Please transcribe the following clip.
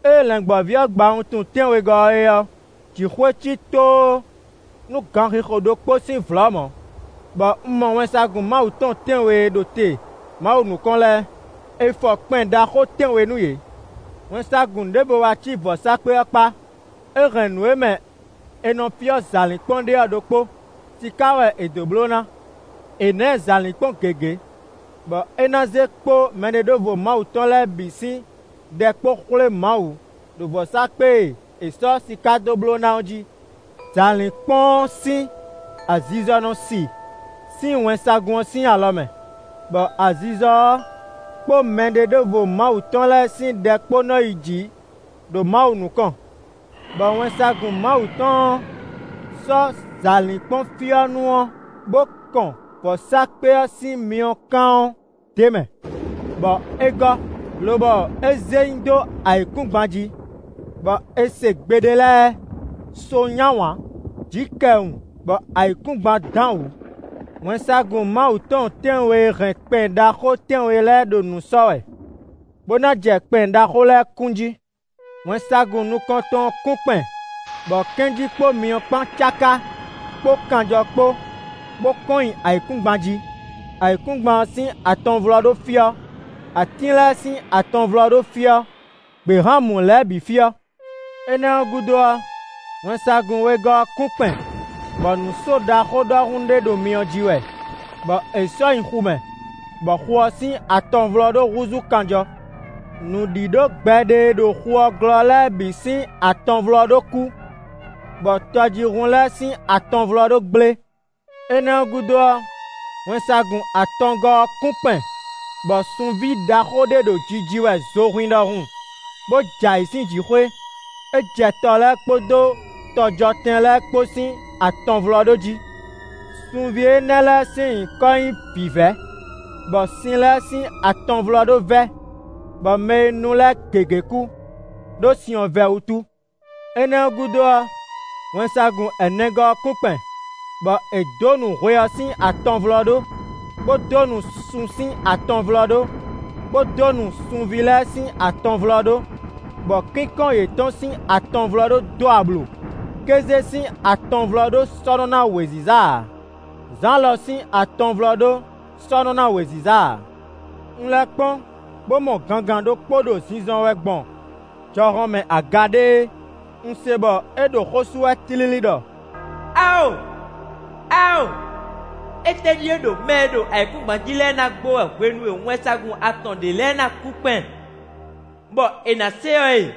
Ée Lɛ̌ngbɔ́ví ɔ́ gba wuntun tɛ́nwegɔ́ ɔ́ é ɔ́, jǐxwé cí tóó nú ganxixo ɖokpó sín vlɔ̌ mɔ̌, bɔ un mɔ wɛnsagun Mawu tɔn tɛ́nwe e ɖo te Mawu nukɔn lɛ́ɛ. È fɔ kpɛn ɖaxó tɛ́nwe nú yě. Wɛnsagun ɖěvo wá cí vɔ̌sákpe ɔ́ kpá; é hɛn nǔ e mɛ è nɔ fyɔ́ zǎlínkpɔ́n ɖe ɔ́ ɖokpó; siká wɛ è dó bló ná. È nǎ ɛ zǎlínkpɔ́n gěgé, bɔ é ná zé kpó mɛɖeɖóvo Mawu tɔn lɛ́ɛ bǐ sín ɖɛ kpó xwlé Mawu ɖo vɔ̌sákpe e è sɔ́ siká dó bló ná ɔ́ jí. Zǎlínkpɔ́n ɔ́ sín azizɔ nɔ sí sín wɛnsagun ɔ́ sín alɔ mɛ, bɔ azizɔ ɔ́ kpó mɛɖeɖóvo Mawu tɔn lɛ́ɛ sín ɖɛ kpó nɔ yi jǐ ɖo Mawu nukɔn. Bɔ wɛnsagun Mawu tɔn ɔ́ sɔ́ zǎlínkpɔ́nfyɔ́nú ɔ́, bó kɔn vɔ̌sákpe ɔ́ sín myɔkán ɔ́ d'é mɛ, bɔ é gɔ́, lobɔ é zé nyi dó ayǐkúngban jí, bɔ é se gbe ɖé lɛ́ɛ; so ny'áwǎn, jǐ kɛ wun, bɔ ayǐkúngban dán wǔ. Wɛnsagun Mawu tɔn tɛ́nwe e hɛn kpɛn ɖaxó tɛ́nwe lɛ́ɛ ɖo nǔ sɔ́ wɛ, bó ná jɛ kpɛn ɖaxó lɛ́ɛ kún jí. Wɛnsagun nukɔntɔn ɔ́ kún kpɛn bɔ kɛ́njí kpó myɔ kpán cáká kpó kanjɔ kpó, bó kɔn nyi ayǐkúngban jí. Ayǐkúngban ɔ́ sín atɔnvlɔ́ɖó fyɔ́; atín lɛ́ɛ sín atɔnvlɔ́ɖó fyɔ́; gběhan mú lɛ́ɛ bǐ fyɔ́. Énɛ́ ɔ́ gúdo ɔ́, wɛnsagun wegɔ́ ɔ́ kún kpɛn, bɔ nǔ só ɖaxó ɖɔhun ɖé ɖo myɔ ji wɛ, bɔ è sɔ́ nyi xu mɛ, bɔ xu ɔ́ sín atɔnvlɔ́ɖó húzú kanjɔ. Nǔɖíɖó gbɛɖe e ɖo xu ɔ́ glɔ́ lɛ́ɛ bǐ sín atɔnvlɔ́ɖó kú, bɔ tɔjíhún lɛ́ɛ sín atɔnvlɔ́ɖó gblé. Énɛ́ ɔ́ gúdo ɔ́, wɛnsagun atɔngɔ́ ɔ́ kún kpɛn bɔ sunví ɖaxó ɖé ɖo jiji wɛ zohwín ɖɔhun, bó jɛ ayǐ sín jǐxwé; é jɛ tɔ lɛ́ɛ kpódó tɔjɔtɛn lɛ́ɛ kpó sín atɔnvlɔ́ɖó jí. Sunví énɛ́ sín nyǐkɔ nɔ́ nyí vǐvɛ́, bɔ sin lɛ́ɛ sín atɔnvlɔ́ɖó vɛ́, bɔ mɛ e nu lɛ́ɛ gěgé kú, ɖó sin ɔ́ vɛ́ wútu. Énɛ́ ɔ́ gúdo ɔ́, wɛnsagun ɛnɛgɔ́ ɔ́ kún kpɛn, bɔ è dǒ nǔ hwe ɔ́ sín atɔnvlɔ́ɖó, bó dó nǔ sun sín atɔnvlɔ́ɖó, bó dó nǔ sunví lɛ́ɛ sín atɔnvlɔ́ɖó, bɔ kínkɔ́n yětɔn sín atɔnvlɔ́ɖó dó ablu; kéze sín atɔnvlɔ́ɖó sɔ́ nɔ ná wěziza ǎ; zǎn lɔ sín atɔnvlɔ́ɖó sɔ́ nɔ ná wěziza ǎ. Un lɛ́ kpɔ́n, bó mɔ gangan ɖokpó ɖo zinzɔn wɛ gbɔn jɔhɔn mɛ aga ɖéé; un se bɔ é ɖo xó sú wɛ tlílí ɖɔ: “Awo! Awo! Étɛ́ ɖíe ɖo mɛ e ɖo ayǐkúngban jí lɛ́ɛ ná gbo wɛ hwenu e wɛnsagun atɔn ɖě lɛ́ɛ ná kún kpɛn, bɔ è nǎ se ɔ́ e?”